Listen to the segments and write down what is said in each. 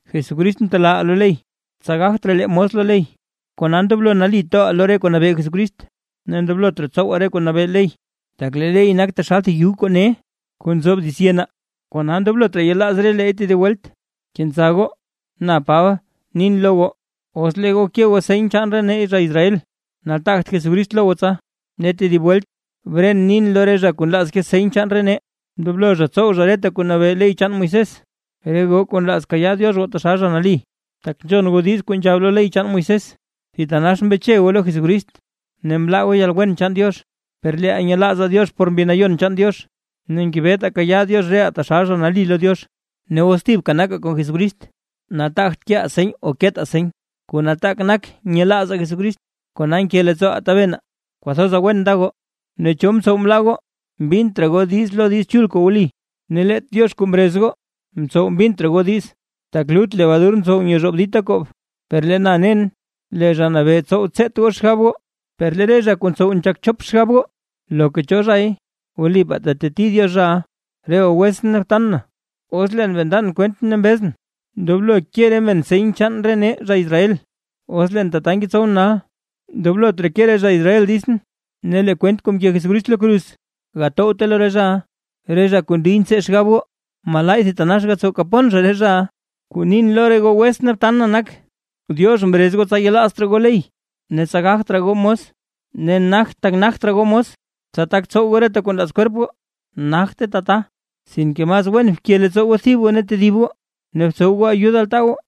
Jesucrist mtelaaʼaa lo ley, tsa gagt raa lee mos lo ley. Kona ndoblo nali toʼaa lo re kuu nabee Jesucrist, ne ndoblot raa tsowaa re kuu nabee ley, tak lee ley nak taxal thib yug kuu ne kuu nzob dits yenaa, kona ndoblot raa yelaaz releey tedib welt. Kenza goo. Na Paba, nin lo goo, os lee goo ke goo seny chaan nee zha Israel, nataagt Jesucrist lo goo tsa. Ne tedib welt bren nin lo re zha kuu nlaaz ke seny chaan re nee, ndoblo zha tsow zha reta kuu nabee ley chaan Moisés. Re goo kuu nlaaz goo kayaa Diox goo taxal zha nali, tak nzhon goo diiz kuu nzhab lo ley chaan Moisés, thitanax mbeche goo lo Jesucrist ne mlaa goo yalwen chaan Diox. Per leeʼaa nyelaazaa Diox por Mbi Nayon chaan Diox, ne ngebetaa kayaa Diox reʼaa taxal zha nali lo Diox. Ne os thibka nakaa kon Jesucrist, nataagt keʼaa seny o ketaa seny. Kuu nataak nak nyelaazaa Jesucrist kona nke leettsooʼaa tabenaa. Kwathoza wen nda goo. Ne, ¿cho mtsow mlaa goo mbint raa goo diiz lo Diiz Chul kuu wli? Ne leet Diox kuu mrez goo, mtsow mbint raa goo diiz. Tak, “lut lebadur ntsow nyezhoob dita koob”. Per lee na nen lee Zha Nabee tsow tseet goo xgab goo, per lee re zha kuu ntsow nzhak chop xgab goo, loka cho zhay, wlipaa teteti Diox zha. Re goo wetsʼn ne btan na, os leen bee ndan kwent ne mbezʼn, ndoblo ke re men seny chaan nee zha Israel, os leen tata ngetsowʼn nal, ndoblot reke re zha Israel ditsʼn, ne lee kwent kuu mke Jesucrist lo kruz gatowte lo re zhaʼa. Re zha kuu ndiy ntsee xgab goo, ¡malaay thitanax gatsow kapon zha re zhaʼa! Kuu nin lo re goo wetsʼn ne btan na nak, Diox mrez goo tsa yelaazt raa goo ley ne tsa gagt raa goo mos. Ne nagt tak nagt raa goo mos, tsa tak tsow goo reta kuu nlaaz kwerp goo, nagte tata. Sinke mas wen bke leettsoo goo thib goo ne tedib goo ne btsow goo ayud altaa goo.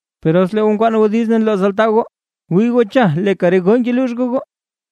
Per os lee goo nkwaan goo diiz ne nlooz altaa goo, wii goo cha leeka re goo ngeluux goo goo.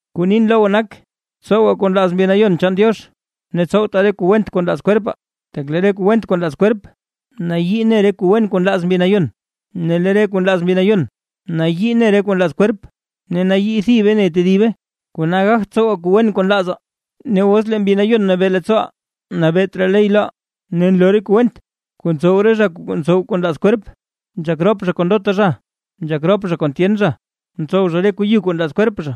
Kuu nin lo goo nak: Tsowaa kuu nlaaz Mbi Nayon chaan Diox ne tsowtaa re kuu went kuu nlaaz kwerpaa. Tak lee re kuu went kuu nlaaz kwerp nayii ne re kuu wen kuu nlaaz Mbi Nayon, ne lee re kuu nlaaz Mbi Nayon nayii ne re kuu nlaaz kwerp. Ne nayii thibe ne tedibe, kona gagt tsowaa kuu wen kuu nlaazaa. Ne os lee Mbi Nayon Nabee leettsooʼaa, nabeet raa ley loʼaa. Ne nloo re kuu went, kuu ntsow re zha kuu ntsow kuu nlaaz kwerp: nzhak rop zha kon ndota zha, nzhak rop zha kon tyen zha, ntsow zha re kuu yu kuu nlaaz kwerp zha,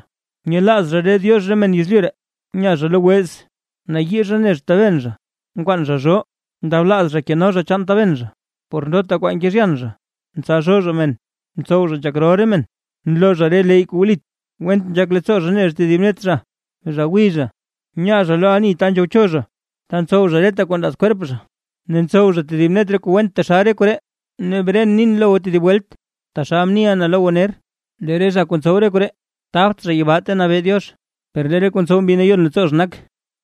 nyelaaz zha re diox re men yezlyu ree, nya zha lo wez, nayii zha ne zha taben zha, nkwaan zha zhoo, ndablaaz zha keno zha chaan taben zha, por ndota kwaa nkezhyan zha, ntsalzhoo zha men, ntsow zha nzhak rol re men, nloo zha re leyy kuu wlit, went nzhak leettsoo zha ne zha tedib net zha, zha gwiy zha, nya zha lo ani ta nzhowcho zha ta ntsow zha reta kuu nlaaz kwerp zha, ne ntsow zha tedib net re kuu went taxal re koree. Ne bren nin lo goo tedib welt, taxal mniʼa na lo goo ner, lee re zha kuu ntsow re koree, tabt zha yibaa ta nabee Diox. Per lee re kuu ntsow Mbi Nayon leettsoo zha nak: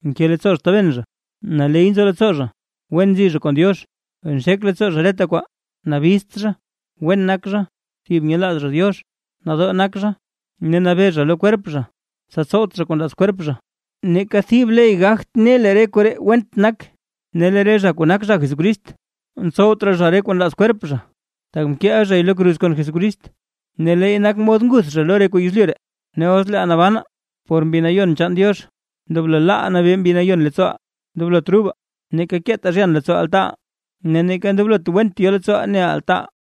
nke leettsoo zha taben zha, naley nzo leettsoo zha, wen nzi zha kon Diox, nxek leettsoo zha reta kwaa, nabizt zha, wen nak zha, thib nyelaaz zha Diox, nadoo nak zha, ne nabee zha lo kwerp zha, tsa tsowt zha kuu nlaaz kwerp zha. Neeka thib ley gagt ne lee re koree went nak. Ne lee re zha kuu nak zha Jesucrist, ntsowt raa zha re kuu nlaaz kwerp zha, tak mkeʼa zhay lo kruz kon Jesucrist, ne leey nak mod nguth zha lo re kuu yezlyu ree. Ne os leeʼaa nabanaa por Mbi Nayon chaan Diox, ndoblo laaʼaa nabee Mbi Nayon leettsooʼaa. Ndoblot rubaa, neeka keetaa zhyan leettsoo altaaʼaa, ne neeka ndoblot went yo leettsooʼaa neʼaa altaaʼaa.